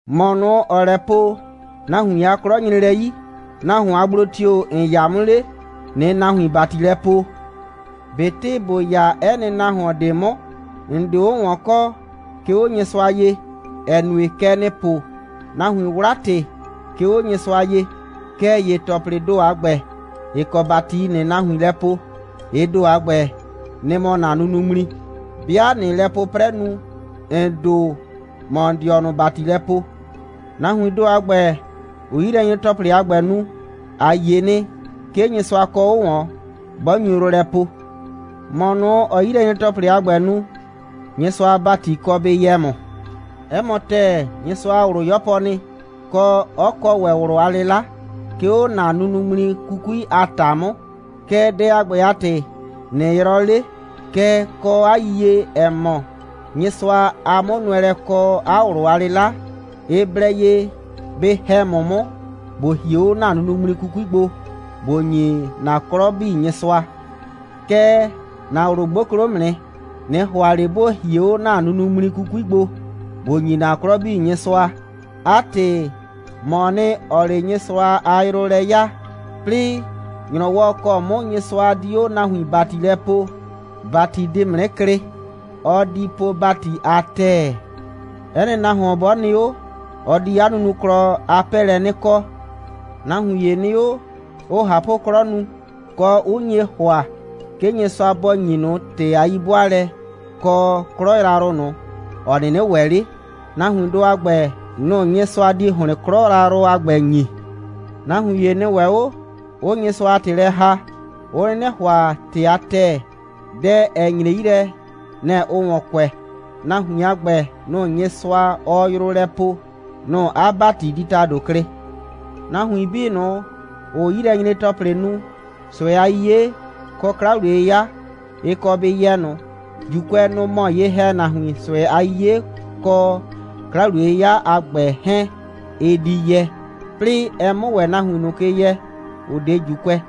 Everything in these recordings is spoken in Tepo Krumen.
‑Mɔ ꞊nʋ, ‑ɔɔ lɛ po: «Nahuin a 'klɔ nyre lɛ 'yi,» nahuon a gblo tio‑ ‑n 'ya 'mʋ 'le, ꞊nɩɩ nahuin ‑bati lɛ poo. ꞊Betɩ ‑bo 'ya 'ɛ nɩ nahuon ꞊de 'mʋ, ‑n 'de 'o ꞊wɔn kɔ, 'ke 'o Nyɩsʋa ye, ‑ɛ nue, kɛ ‑nɩɩ po: «Nahuiin 'wla ‑tɩ, 'ke 'o Nyɩsʋa ye,» kɛɛ ‑ye ‑tɔplɩɩ ‑do a ‑gbɛ, ‑ɩ kɔ ‑bati ‑nɩɩ nahuin lɛ poo, ɩ ‑do a ‑gbɛ, nɩ‑ mɔ ‑na nunuŋmli. 'Bɩa ꞊nɩɩ lɛ 'pʋprɛ nu, ‑n ‑do, ‑mɔɔ ‑n dɩɔnʋ ‑bati lɛ poo. Nahuiin ‑do a ‑gbɛ, ‑ʋʋ 'yilɛnyre‑tɔplɩ a ‑gbɛ nu, ‑a yie nɩ, 'ke Nyɩsʋa kɔ 'o ꞊wɔn, 'bɔ nyu yrʋ lɛ poo. ‑Mɔ ꞊nʋ, ‑ɔɔ 'yilɛnyre‑tɔplɩ a ‑gbɛ nu, Nyɩsʋa a ‑bati kɔ bɩ yɛ ‑mʋ. 'Ɛ mɔ ‑tɛɛ, Nyɩsʋa a ꞊wlʋ 'yɔpɔ nɩ, kɔ, 'ɔ kɔ ‑wɛ ꞊wlʋ a 'lɩla, 'ke 'o ‑na nunuŋmli 'kukui a ‑ta 'mʋ. Kɛɛ, dɛ a ‑gbɛ a ‑tɩ, ꞊nɩ yrɔɔ 'le. Kɛɛ, kɔ 'a yiyie, ‑ɛ mɔ, Nyɩsʋa a 'mʋnʋɛlɛ, kɔ 'a ꞊wlʋ a 'lɩla, ɩ blɛ ye bɩ ‑hɛ ‑mʋ 'mʋ, ‑bo hie 'o ‑na nunuŋmli 'kukui gbo, ‑bo ‑nyi ‑na 'klɔ 'bii Nyɩsʋa. Kɛɛ, ‑na ꞊wlʋ 'gboklo 'mʋ nɩ. ꞊Nɩ ‑hʋa ꞊le ‑bo hie 'o ‑na nunuŋmli 'kukui gbo, ‑bo ‑nyi ‑na 'klɔ 'bii Nyɩsʋa. 'A ‑tɩ, ‑mɔɔ nɩ, ‑ɔɔ 'le Nyɩsʋa a yrʋ lɛ 'yaa. 'Plɩɩ, ‑nyrɔwɔ ‑kɔ 'mʋ Nyɩsʋa di 'o nahuin ‑bati lɛ poo, ‑bati di ‑mʋ 'nɩ klɩ. Ɔ di po ‑bati a ‑tɛɛ. 'Ɛ nɩ nahuon 'bɔ nɩ 'o, ɔ di 'a nunuklɔ a 'pɛɛlɛ 'nɩ kɔ. Nahuin ‑ye nɩ 'o, 'ʋʋ ꞊hapʋ'klɔ nu, kɔ, 'ʋ nye ‑hʋa, 'ke Nyɩsʋa bɔ ‑nyi ꞊nʋ ‑tɩ a 'yi'bʋaalɛ kɔ 'klɔ yrayrʋ ꞊nʋ, ‑ɔ 'nɩnɩ ‑wɛ 'le. Nahuindʋ a ‑gbɛ, nʋ‑ Nyɩsʋa di ‑hlɩn 'klɔ yrayrʋ a ‑gbɛ ‑nyi. Nahuin ‑ye nɩ ‑wɛ 'o, 'ʋʋ Nyɩsʋa a ‑tɩ lɛ ‑haa, 'ʋ 'nɩnɩ ‑hʋa ‑tɩ a ‑tɛɛ. Dɛ, ‑ɛ nyre 'yi lɛ, nɛ‑ ʋʋ ‑wɔn kʋɛ. Nahuin a ‑gbɛ, nʋ‑ Nyɩsʋa, ɔɔ yrʋ lɛ poo, nʋ‑ 'a ‑bati di ‑tado klɩ. Nahuin 'bii ꞊nʋ, ‑ʋʋ 'yilɛnyre‑tɔplɩ nu, ꞊sʋɛ a 'yiye kɔ 'kla‑wliye'yɩya, ɩ kɔ bɩ yɛ ꞊nʋ. ‑Juukʋɛ, nʋ‑ mɔ ye‑hɛnahuin, ꞊sʋɛ a 'yiye kɔ 'kla‑wliye'yɩya a ‑gbɛ 'hɛɛn, ɩ di yɛ, 'plɩɩ ɛ 'mʋ ‑wɛ nahuin ꞊nʋ ke yɛ, ‑ʋ 'de ‑Juukʋɛ.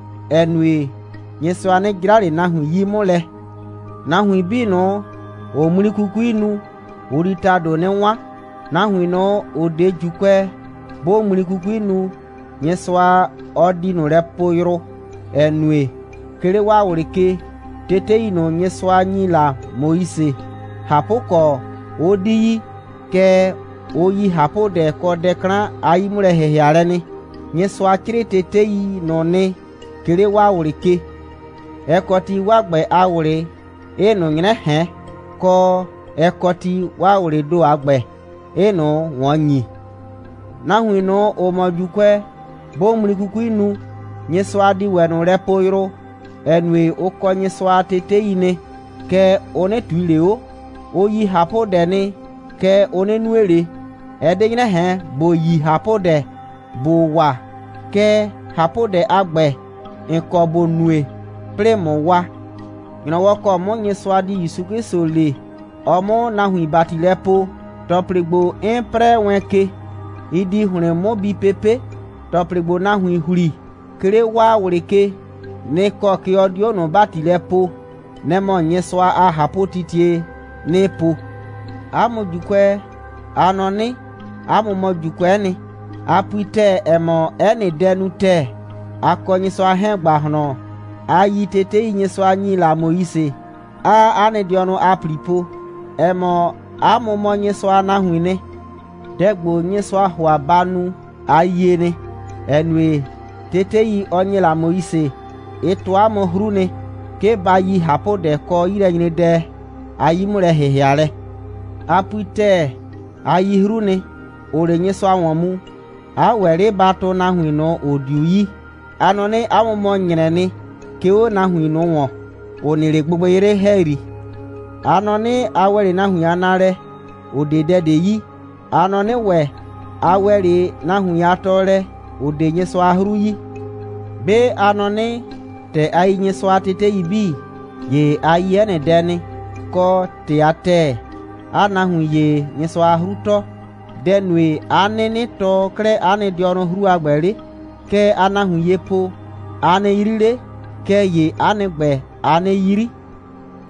‑ɛ nue, Nyɩsʋa 'nɩ 'jra ꞊le nahuin 'yi 'mʋ lɛ. Nahuin 'bii ꞊nʋ, ‑ʋʋ ŋmli 'kukui nu, ʋ di ‑tado 'nɩ 'wan. Nahuin ꞊nʋ, ‑ʋ 'de ‑Juukʋɛ, 'bʋʋ ŋmli 'kukui nu, Nyɩsʋa, ɔ di ꞊nʋ lɛ poo yrʋ, ‑ɛ nue, 'ke 'le 'waa ꞊wlɩ ke, tetei ꞊nʋ, Nyɩsʋa ‑nyi la Moise, ꞊hapʋkɔ, 'ʋ 'di yi, kɛɛ, ʋ yi ꞊hapʋdɛ kɔ dɛ 'klan a 'yi'mʋlɛ‑hɩhɩalɛ nɩ. Nyɩsʋa 'crɩɩ tetei ꞊nʋ nɩ, 'ke 'le 'waa ꞊wlɩ ke. Ɛ kɔ ti, 'waa ‑gbɛ a ꞊wlɩ 'ɩɩ ꞊nʋ 'nyrɛ ꞊hɛn, kɔ, ɛ kɔ ti, 'waa ꞊wlɩɩ ‑do a ‑gbɛ 'ɩɩ ꞊nʋ ꞊wɔn ‑nyi. Nahuin ꞊nʋ, ‑ʋ mɔ ‑Juukʋɛ, 'bʋʋ ŋmli 'kukui nu, Nyɩsʋa di ‑wɛ ꞊nʋ lɛ po yrʋ, ‑ɛ nue, ʋ kɔ Nyɩsʋa a tetei nɩ, kɛɛ, ʋ 'nɩ ꞊tui ꞊le 'o. Ʋ yi ꞊hapʋdɛ nɩ, kɛɛ, ʋ 'nɩ nue ꞊le. Ɛ 'de 'nyrɛ ꞊hɛn, ‑bo yi ꞊hapʋdɛ ‑bo wa, kɛɛ, ꞊hapʋdɛ a ‑gbɛ, ‑n kɔ ‑bo nue, 'plɩɩ ꞊mʋ wa. ‑Nyrɔwɔ ‑kɔ 'mʋ Nyɩsʋa di ‑Yusu 'Klɩsʋ le, ɔ 'mʋ nahuin ‑bati lɛ poo, ‑tɔplɩ ‑gbo, 'n 'prɛɛ wɛn ke, ɩ di ‑hlɩn 'mʋ bi pepe'. ‑Tɔplɩ ‑gbo, nahuiin ‑hli, 'ke 'le 'waa ꞊wlɩ ke, nɩ‑ kɔ ke ɔ di 'o ꞊nʋ ‑bati lɛ poo. Nɛ‑ mɔ Nyɩsʋa a ꞊hapʋtitie, 'nɩɩ po. 'A mʋ ‑Juukʋɛ, a nɔ 'nɩ, 'a mʋ mɔ ‑Juukʋɛ'ɛ nɩ. A pui ‑tɛɛ, ‑ɛ mɔ, 'ɛ nɩ dɛ nu ‑tɛɛ, a kɔ Nyɩsʋa 'hɛɛn ‑gbahlɔn, a yi tetei, Nyɩsʋa ‑nyi la Moise, 'aa 'a nɩ dɩɔnʋ a ‑pli po, ‑ɛ mɔ, 'a mʋ mɔ Nyɩsʋa a nahuiin nɩ. Dɛ ‑gbo, Nyɩsʋaa ‑hʋa ba nu, a yie nɩ, ‑ɛ nue, tetei, ɔ ‑nye la Moise, ɩ tɔɔ 'a mʋ 'hru nɩ, 'ke ba yi ꞊hapʋdɛ kɔ 'yilɛnyredɛ a 'yi'mʋlɛ‑hɩhɩalɛ. A pui ‑tɛɛ, a yi 'hru nɩ, ‑ʋʋ 'le Nyɩsʋa ‑wɔn mu, 'a ‑wɛ 'le ba tʋʋ nahuin ꞊nʋ, ‑ʋ 'diu yi. A nɔ 'nɩ, 'a mʋ mɔ ‑nyrɛɛ nɩ, 'ke 'o nahuin ꞊nʋ ‑wɔn, ‑ʋ nɩ 'le gbɩgbɩyrɩ ‑hɛyri. A nɔ 'nɩ, a ‑wɛ 'le nahuin a naalɛ, ‑ʋ 'de dɛ ꞊de yi. A nɔ 'nɩ ‑wɛ, a ‑wɛ 'le nahuin a tɔɔlɛ, ‑ʋ 'de Nyɩsʋa a 'hru yi. 'Be a nɔ 'nɩ, ‑tɛ a yi Nyɩsʋa a tetei 'bii, ‑ye a yi 'ɛ nɩ dɛ nɩ, kɔ ‑tɩ a ‑tɛɛ, 'aa nahuin ‑ye Nyɩsʋa a 'hru tɔɔ. Dɛ‑ nue, 'a 'nɩnɩ tɔɔ 'klɛɛ 'a nɩ dɩɔnʋ 'hru a ‑gbɛ 'le? Kɛ aa nahuin ye po: «A nɩ 'yri 'le!» Kɛɛ ‑ye 'a nɩ ‑gbɛ, aa 'nɩ 'yri.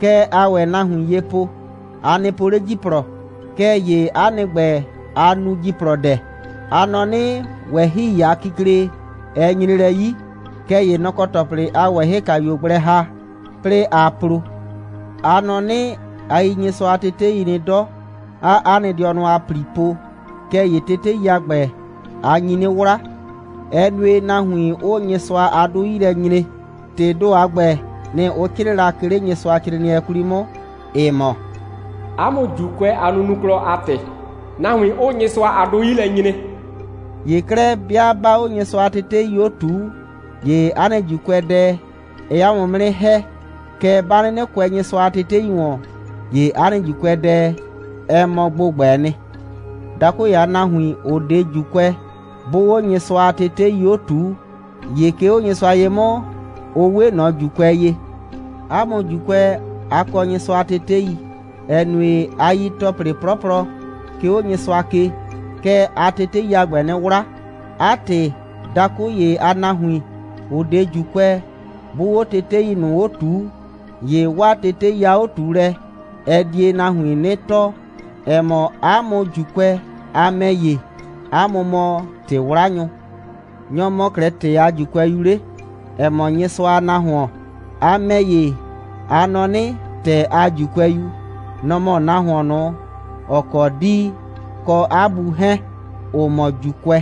Kɛ aa ‑wɛ nahuin ye po: «A nɩ po 'le ‑jiplɔ!» Kɛɛ ‑ye 'a nɩ ‑gbɛ, aa nu ‑jiplɔdɛ. A nɔ 'nɩ, ꞊wɛhɩi a kikle, ɛ nyre lɛ 'yi, kɛɛ ‑ye nɔ‑ kɔ ‑tɔplɩ aa ꞊wɛhɩkayuo gblɛ ‑ha, 'plɩɩ aa plo. A nɔ 'nɩ, a yi Nyɩsʋa a tetei nɩ 'dɔ, 'aa 'a nɩ dɩɔnʋ a ‑pli po, kɛɛ ‑ye tetei a ‑gbɛ, a nyi 'nɩ 'wla. Ɛ nue, nahuin 'ʋʋ Nyɩsʋa a 'dʋ 'yi lɛ nyre. ‑Tɩɩ ‑do a ‑gbɛ, nɩ‑ ʋ 'crɩɩ la, 'ke 'le Nyɩsʋacrɩɩnɩɛ 'kwli 'mʋ, ‑ɩ mɔ: «'A mʋ ‑Juukʋɛ a nunuklɔ a ‑tɩ, nahuin 'ʋʋ Nyɩsʋa a 'dʋ 'yi lɛ nyre.» ‑Ye 'klɛɛ, 'bɩa 'baa 'o Nyɩsʋa a tetei 'o ꞊tuu, ‑ye 'a nɩ ‑Juukʋɛdɛ, ɛɛ 'a mʋ 'mʋ 'nɩ ‑hɛ. Kɛɛ, 'ba 'nɩnɩ kʋɛ Nyɩsʋa a tetei ‑wɔn, ‑ye 'a nɩ ‑Juukʋɛdɛ, ɛ mɔ ‑gbʋgbɛɛ nɩ. Dakʋ ‑ye a nahuin, ‑ʋ 'de ‑Juukʋɛ, 'bʋʋ 'o Nyɩsʋa a tetei 'o ꞊tuu, ‑ye 'ke 'o Nyɩsʋa ye 'mʋ, ʋ 'we ꞊nɔ ‑Juukʋɛ ye. 'A mʋ ‑Juukʋɛ, a kɔ Nyɩsʋa a tetei. Ɛ nue, 'a yi ‑tɔplɩ 'plɔplɔ, 'ke 'o Nyɩsʋa ke, kɛɛ, aa tetei a ‑gbɛ 'nɩ 'wla. 'A ‑tɩ, dakʋ ‑ye a nahuin, ‑ʋ 'de ‑Juukʋɛ, 'bʋʋ 'o tetei ꞊nʋ 'o ꞊tuu, ‑ye 'waa tetei a 'o꞊tuulɛ, ɛ die nahuin 'nɩ tɔɔ, ‑ɛ mɔ, 'a mʋ ‑Juukʋɛ, a ‑mɛ ‑ye, 'a mʋ mɔ ‑tɩ'wlanyʋ. Nyɔ‑ mɔ 'klɛɛ ‑tɛɛ a ‑Juukʋɛyu 'le, ‑ɛ mɔ Nyɩsʋa a nahuon? A ‑mɛ ‑ye, a nɔ 'nɩ, ‑tɛɛ a ‑Juukʋɛyu, nɔ‑ mɔ nahuon ꞊nʋ, ‑ɔ kɔ 'dii kɔ 'a bu 'hɛɛn, ‑ʋ mɔ ‑Juukʋɛ,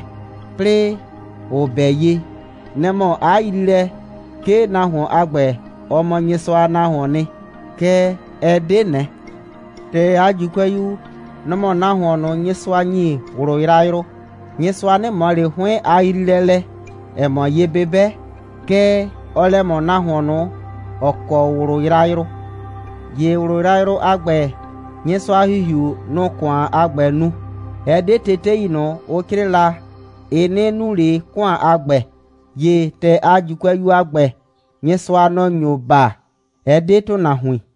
'plɩɩ ʋ 'bɛ ye, nɛ‑ mɔ 'a yriilɛ, 'ke nahuon a ‑gbɛ, ɔ mɔ Nyɩsʋa a nahuoon nɩ. Kɛɛ, ɛ 'de ꞊nɛ. ‑Tɛɛ a ‑Juukʋɛyu, nɔ‑ mɔ nahuon ꞊nʋ, Nyɩsʋa ‑nyi ꞊wlʋ yrayrʋ. Nyɩsʋa 'nɩ ꞊mɔ ꞊le 'hʋɩn a yriilɛ lɛ, ‑ɛ mɔ ye'bɩbɛ, kɛɛ, ɔɔ lɛ ꞊mɔ nahuon ꞊nʋ, ‑ɔ kɔ ꞊wlʋ yrayrʋ. ‑Ye ꞊wlʋ yrayrʋ a ‑gbɛ, Nyɩsʋa a ‑Hihiu, nʋ‑ʋ ‑kʋan a ‑gbɛ nu. Ɛ 'de tetei ꞊nʋ, ʋ 'crɩɩ la, ɩ 'nɩ nu ꞊le ‑kʋan a ‑gbɛ. ‑Ye ‑tɛɛ a ‑Juukʋɛyu a ‑gbɛ, Nyɩsʋa, nɔ‑ nyo baa, ɛ 'de ‑tʋnahuin.